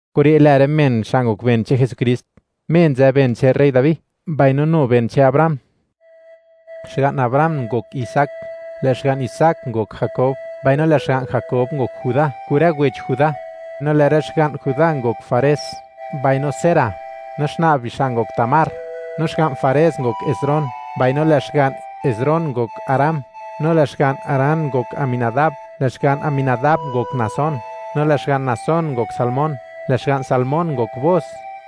Kure' lë rë men xa' ngok ben che'n Jesukrist, Me nzë ben che'n rey Dabi, mbaino nu ben che'n Abraham. Xga'n Abraham ngok Isaac, lë' xga'n Isaac ngok Jakob, mbaino lë' xga'n Jakob ngok Judá kun rë wech Judá. No lë' rë xga'n Judá ngok Fares mbaino Zara, no xna' bixa' ngok Tamar. No xga'n Fares ngok Esrom, mbaino lë' xga'n Esrom ngok Aram. No lë' xga'n Aram ngok Aminadab, lë' xga'n Aminadab ngok Naasón, no lë' xga'n Naasón ngok Salmón. Lë' xga'n Salmón ngok Booz,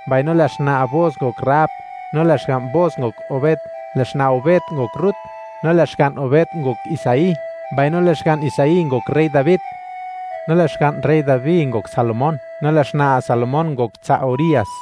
mbaino lë' xna' Booz ngok Rahab. No lë' xga'n Booz ngok Obed, lë' xna' Obed ngok Rut. No lë' xga'n Obed ngok Isaí. Mbaino lë' xga'n Isaí ngok rey Dabi, no lë' xga'n rey Dabi ngok Salomón, no lë' xna' Salomón ngok tsa' Urías.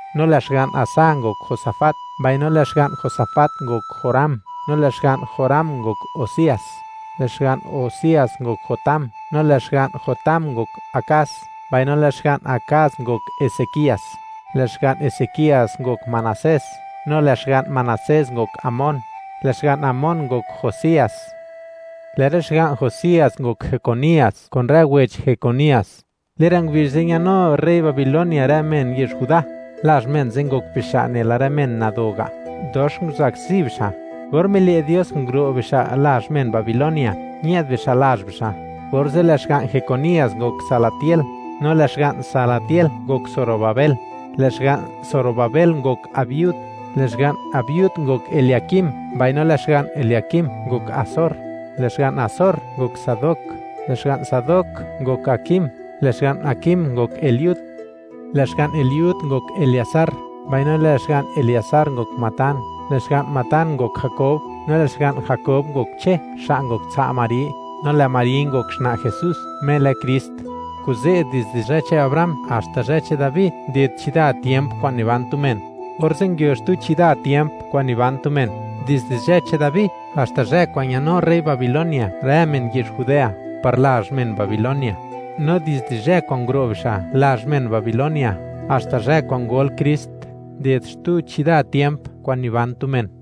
No lë' xga'n Asa ngok Josafat, mbaino lë' xga'n Josafat ngok Joram, no lë' xga'n Joram ngok Uzías. Lë' xga'n Uzías ngok Jotam, no lë' xga'n Jotam ngok Akaz, mbaino lë' xga'n Akaz ngok Hezekías. Lë' xga'n Hezekías ngok Manasés, no lë' xga'n Manasés ngok Amón. Lë' xga'n Amón ngok Josías. Lë' rë xga'n Josías ngok Jecunías kun rë wech Jecunías. Le'n rë ngubizh ze' ñanu rey Babilonia rë men yezh Judá. Lazh men ze' ngok bixa' nela rë men nado ga', dox nguzakzi bixa'. Or mile' Dios nguro' bixa' lazh men Babilonia, ñë'd bixa' lazh bixa'. Orze' lë' xga'n Jecunías ngok Salatiel, no lë' xga'n Salatiel ngok Zorobabel. Lë' xga'n Zorobabel ngok Abihud, lë' xga'n Abihud ngok Eliakim, mbaino lë' xga'n Eliakim ngok Azor. Lë' xga'n Azor ngok Sadok, lë' xga'n Sadok ngok Akim, lë' xga'n Akim ngok Eliud. Lë' xga'n Eliud ngok Eleazar, mbaino lë' xga'n Eleazar ngok Matán, lë' xga'n Matán ngok Jakob, no lë' xga'n Jakob ngok Che, xa' ngok tsa' Mari, no lë' Mari ngok xna' Jesús, Me lë Krist. Kuze', dizde zhë che'n Abraham haxta zhë che'n Dabi nded chida tiemp kwa'n niban tu men, orze' nguio xtu chida tiemp kwa'n niban tu men dizde zhë che'n Dabi haxta zhë kwa'n ñanu rey Babilonia rë men yezh Judea par lazh men Babilonia. No dizde zhë kwa'n nguro' bixa' lazh men Babilonia haxta zhë kwa'n ngol Krist, nded xtu chida tiemp kwa'n niban tu men.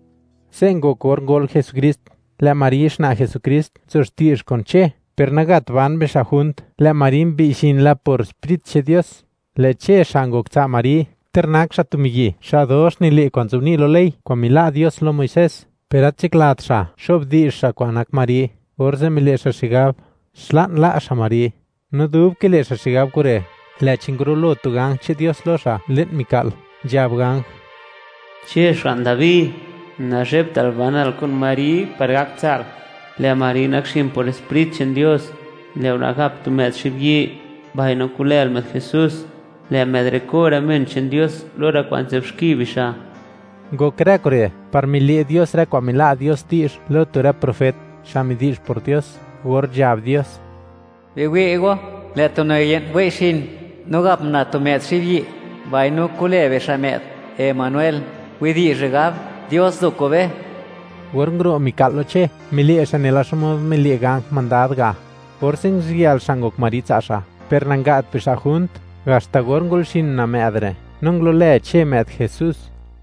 Se' ngok or ngol Jesukrist: lë' Mari, xna' Jesukrist, nzo xti'zh kun Che; per nagat ban bixa' junt, lë' Mari mbi'y xin la por Sprit che'n Dios. Lë' Che xa' ngok tsa' Mari, ter nak xa' tu miyi' xa' dox nile' kwa'n nzobni' lo ley kwa'n mila' Dios lo Muisés, per gat nzhaklat xa' xo'bdi'zh xa' kwan nak Mari, orze' mile' xa' xigab, xla'n la' xa' Mari. No dub kile' xa' xigab kure', lë'chi ngurulo tu ganj che'n Dios lo xa' le'n mika'l, nzhab ganj: ―Che, xga'n Dabi, nazhebtal banal kun Mari par gak tsa'l; lë' Mari nakxin por Sprit che'n Dios. Lë' una' gap tu më'd xibyi', mbaino ku'lël më'd JESÚS; lë' më'd re' ko' rë men che'n Dios lo rë kwa'n nzë'b xki bixa'. Ngok rë kure' par mile' Dios rë kwa'n mila' Dios di'zh lo tu rë profet, xa' midi'zh por Dios, or nzhab Dios: Biwi' go, lë' tu una' ye'n wei' xin, no gap una' tu më'd xibyi', mbaino ku'lë bixa' më'd Emanuel. Widi'zh re' gab: Dios nzo kun be. Or nguro' mika'l lo Che, mile' xa' nela xmod mile' ganj mandad ga'. Orze' nguziyël xa' ngok Mari tsa' xa', per nanga't bixa' junt, haxta or ngol xin una' më'd re'; no ngulo'lë Che më'd JESÚS.